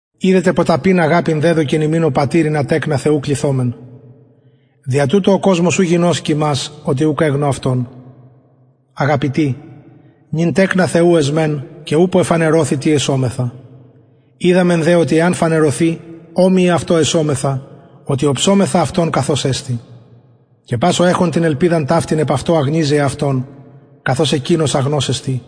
ιδετε ποταπην αγαπην δεδωκεν ημιν ο πατηρ ινα τεκνα θεου κληθωμεν δια τουτο ο κοσμος ου γινωσκει υμας οτι ουκ εγνω αυτον αγαπητοι νυν τεκνα θεου εσμεν και ουπω εφανερωθη τι εσομεθα οιδαμεν δε οτι εαν φανερωθη ομοιοι αυτω εσομεθα οτι οψομεθα αυτον καθως εστιν και πας ο εχων την ελπιδα ταυτην επ αυτω αγνιζει εαυτον καθως εκεινος αγνος εστιν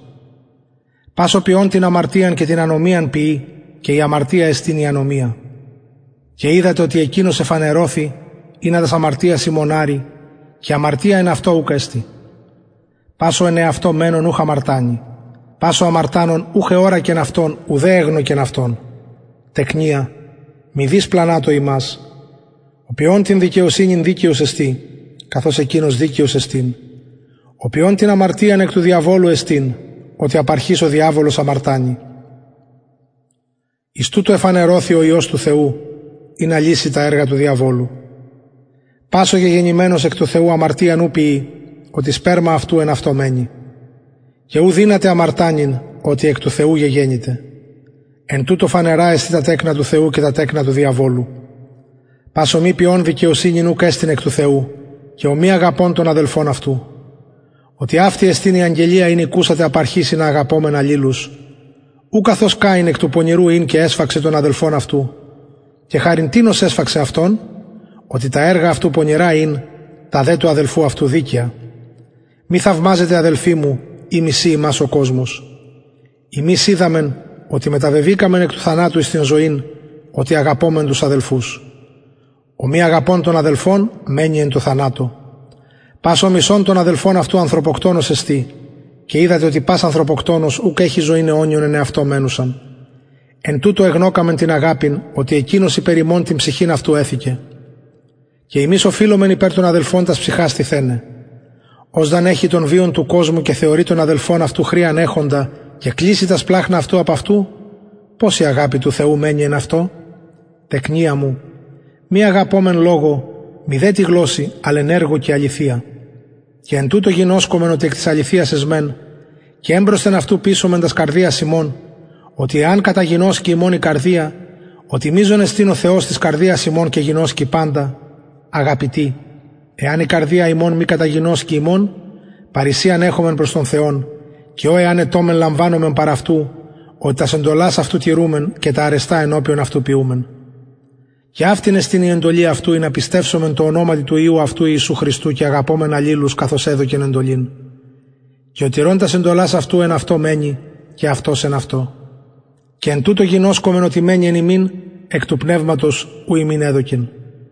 πας ο ποιων την αμαρτιαν και την ανομιαν ποιει και η αμαρτια εστιν η ανομια και οιδατε οτι εκεινος εφανερωθη ινα τας αμαρτιας ημων αρη και αμαρτια εν αυτω ουκ εστιν πας ο εν αυτω μενων ουχ αμαρτανει πας ο αμαρτανων ουχ εωρακεν αυτον ουδε εγνωκεν αυτον τεκνια μηδεις πλανατω υμας ο ποιων την δικαιοσυνην δικαιος εστιν καθως εκεινος δικαιος εστιν ο ποιων την αμαρτιαν εκ του διαβολου εστιν οτι απ αρχης ο διαβολος αμαρτανει εις τουτο εφανερωθη ο υιος του θεου ινα λυση τα εργα του διαβολου πας ο γεγεννημενος εκ του θεου αμαρτιαν ου ποιει οτι σπερμα αυτου εν αυτω μενει και ου δυναται αμαρτανειν οτι εκ του θεου γεγεννηται εν τουτω φανερα εστιν τα τεκνα του θεου και τα τεκνα του διαβολου πας ο μη ποιων δικαιοσυνην ουκ εστιν εκ του θεου και ο μη αγαπων τον αδελφον αυτου οτι αυτη εστιν η αγγελια ην ηκουσατε απ αρχης ινα αγαπωμεν αλληλους ου καθως καιν εκ του πονηρου ην και εσφαξεν τον αδελφον αυτου και χαριν τινος εσφαξεν αυτον οτι τα εργα αυτου πονηρα ην τα δε του αδελφου αυτου δικαια μη θαυμαζετε αδελφοι μου ει μισει υμας ο κοσμος ημεις οιδαμεν οτι μεταβεβηκαμεν εκ του θανατου εις την ζωην οτι αγαπωμεν τους αδελφους ο μη αγαπων τον αδελφον μενει εν τω θανατω πας ο μισων τον αδελφον αυτου ανθρωποκτονος εστιν και οιδατε οτι πας ανθρωποκτονος ουκ εχει ζωην αιωνιον εν εαυτω μενουσαν εν τουτω εγνωκαμεν την αγαπην οτι εκεινος υπερ ημων την ψυχην αυτου εθηκεν και ημεις οφειλομεν υπερ των αδελφων τας ψυχας τιθεναι ος δ αν εχη τον βιον του κοσμου και θεωρη τον αδελφον αυτου χρειαν εχοντα και κλειση τα σπλαγχνα αυτου απ αυτου πως η αγαπη του θεου μενει εν αυτω τεκνια μου μη αγαπωμεν λογω μηδε τη γλωσση αλλ εν εργω και αληθεια και εν τουτω γινωσκομεν οτι εκ της αληθειας εσμεν και εμπροσθεν αυτου πεισομεν τας καρδιας ημων οτι εαν καταγινωσκη ημων η καρδια οτι μειζων εστιν ο θεος της καρδιας ημων και γινωσκει παντα αγαπητοι εαν η καρδια ημων μη καταγινωσκη ημων παρρησιαν εχομεν προς τον θεον και ο εαν αιτωμεν λαμβανομεν παρ αυτου οτι τας εντολας αυτου τηρουμεν και τα αρεστα ενωπιον αυτου ποιουμεν και αυτη εστιν η εντολη αυτου ινα πιστευσωμεν τω ονοματι του υιου αυτου ιησου χριστου και αγαπωμεν αλληλους καθως εδωκεν εντολην και ο τηρων τας εντολας αυτου εν αυτω μενει και αυτος εν αυτω και εν τουτω γινωσκομεν οτι μενει εν ημιν εκ του πνευματος ου ημιν εδωκεν